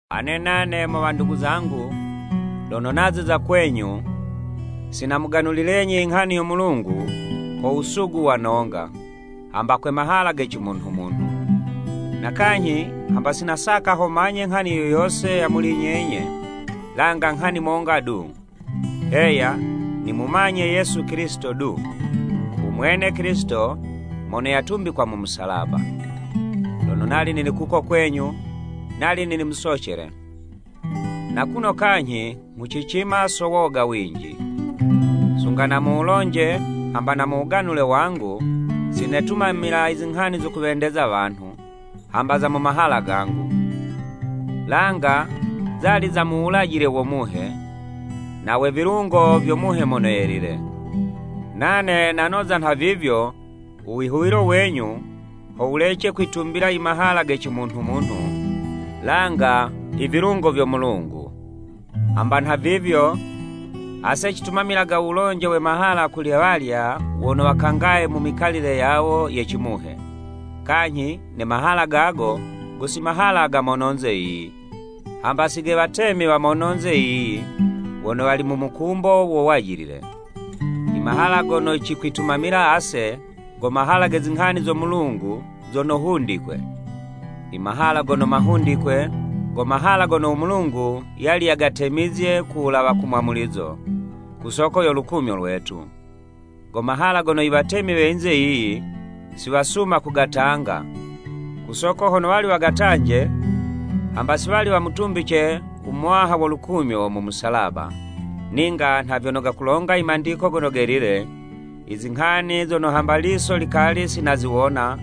Ane nane, mo wandugu zangu, lono naziza kwenyu, si namuganulilenyi inghani yo Mulungu ko wusugu wa nonga, hamba kwe mahala ge cimunhumunhu. Na kanyhi, hamba si nasaka ho manye nghani yo yose ya muli nyenye, langa nghani monga du, heya, nimumanye Yesu Kilisito du, u mwene Kilisito mono yatumbikwa mu musalaba. Lono nali nili kuko kwenyu, nali nili musocele, na kuno kanyhi nghucicima so woga winji. Sunga na muwulonje hamba na mu wuganule wangu, sinetumamila i zinghani zo kuwendeza wanhu, hamba za mu mahala gangu, langa zali za mu wulajile wo Muhe, na we vilungo vyo Muhe Mono Yelile. Nane nanoza nhavivyo, u wihuwilo wenyu ho wulece kwitumbila imahala ge cimunhumunhu, langa ivilungo vyo Mulungu. Hamba nhavivyo, ase citumamilaga u wulonje we mahala kuli walya wono wakangaye mu mikalile yawo ye cimuhe, kanyhi ne mahala gago go si mahala ga mononze yiyi, hamba si ge watemi wa mono yinze yiyi, wono wali mu mukumbo wo wajilile. Imahala gono cikwitumamila ase, go mahala ge zinghani zo Mulungu zono hundikwe, imahala gono mahundikwe, go mahala gono u Mulungu yali yagatemizye ku wulawa ku mwamulizo, ku soko yo lukumyo lwetu. Go mahala gono i watemi we yinze yiyi, si wasuma kugatanga, ku soko hono wali wagatanje, hamba si wali wamutumbice u Muwaha wo lukumyo mu musalaba, ninga nha vyono gakulonga i Mandiko Gono Gelile, “Izinghani zono hamba liso likali si naziwona,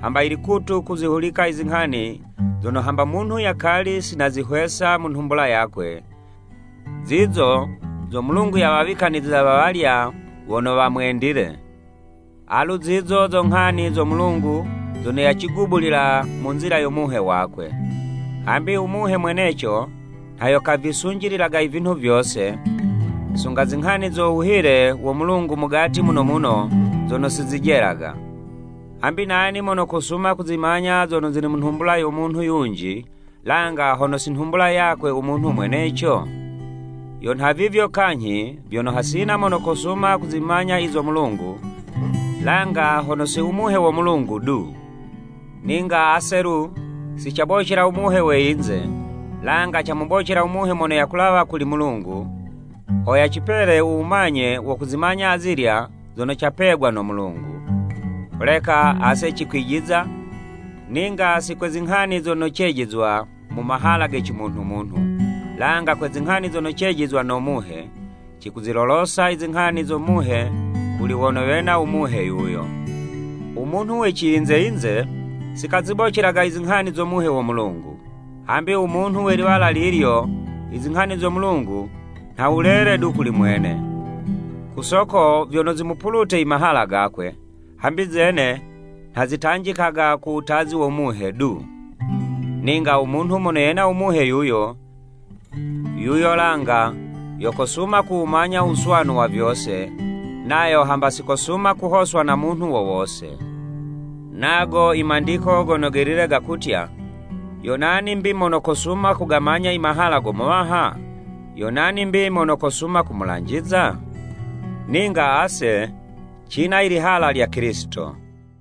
hamba i likutu kuzihulika izinghani zono, hamba munhu yakali si nazihwesa mu nhumbula yakwe, zizo zo Mulungu yawawikaniziza wa walya wono wamwendile.” Alu zizo zo nghani zo Mulungu zono yacigubulilila mu nzila yo Muhe wakwe. Hambi u Muhe mweneco nha yo kavisunjililaga i vinhu vyose, sunga zinghani zo wuhile wo Mulungu mugati muno muno zono sizijelaga. Hambi nani mono kosuma kuzimanya zono zili mu nhumbula yo munhu yunji, langa hono si nhumbula yakwe u munhu mweneco? Yo nhavivyo kanyhi vyono, hasina mono kosuma kuzimanya i zo Mulungu, langa hono si u Muhe wo Mulungu du. Ninga ase alu, si cabocela u muhe we yinze, langa camubocela u Muhe mono yakulawa kuli Mulungu, ho yacipele u wumanye wo kuzimanya azilya zono capegwa no Mulungu. Holeka ase cikwijiza, ninga si kwe zinghani zono cejizizwa mu mahala ge cimunhumunhu, langa kwe zinghani zono cejizwa no Muhe, cikuzilolosa i zinghani zo Muhe kuli wono wena u Muhe yuyo. U munhu we ciyinze-yinze si kazibocelaga izinghani zo Muhe wo Mulungu. Hambi u munhu we liwala lilyo, izinghani zo Mulungu, nha wulele du kuli mwene, ku soko vyono zimupulute imahala gakwe, hambi zene, nha zitanjikaga ko wutazi wo Muhe du. Ninga u munhu mono yena u Muhe yuyo, yuyo langa yo kosuma kuwumanya u wuswanu wa vyose, nayo hamba sikosuma kuhoswa na munhu wo wose. Nago i Mandiko Gono Gelile gakutya, “Yo nani mbi mono kosuma kugamanya i mahala go Muwaha? Yo nani 'mbi mono kosuma kumulanjiza?” Ninga ase, cina i lihala lya Kilisito.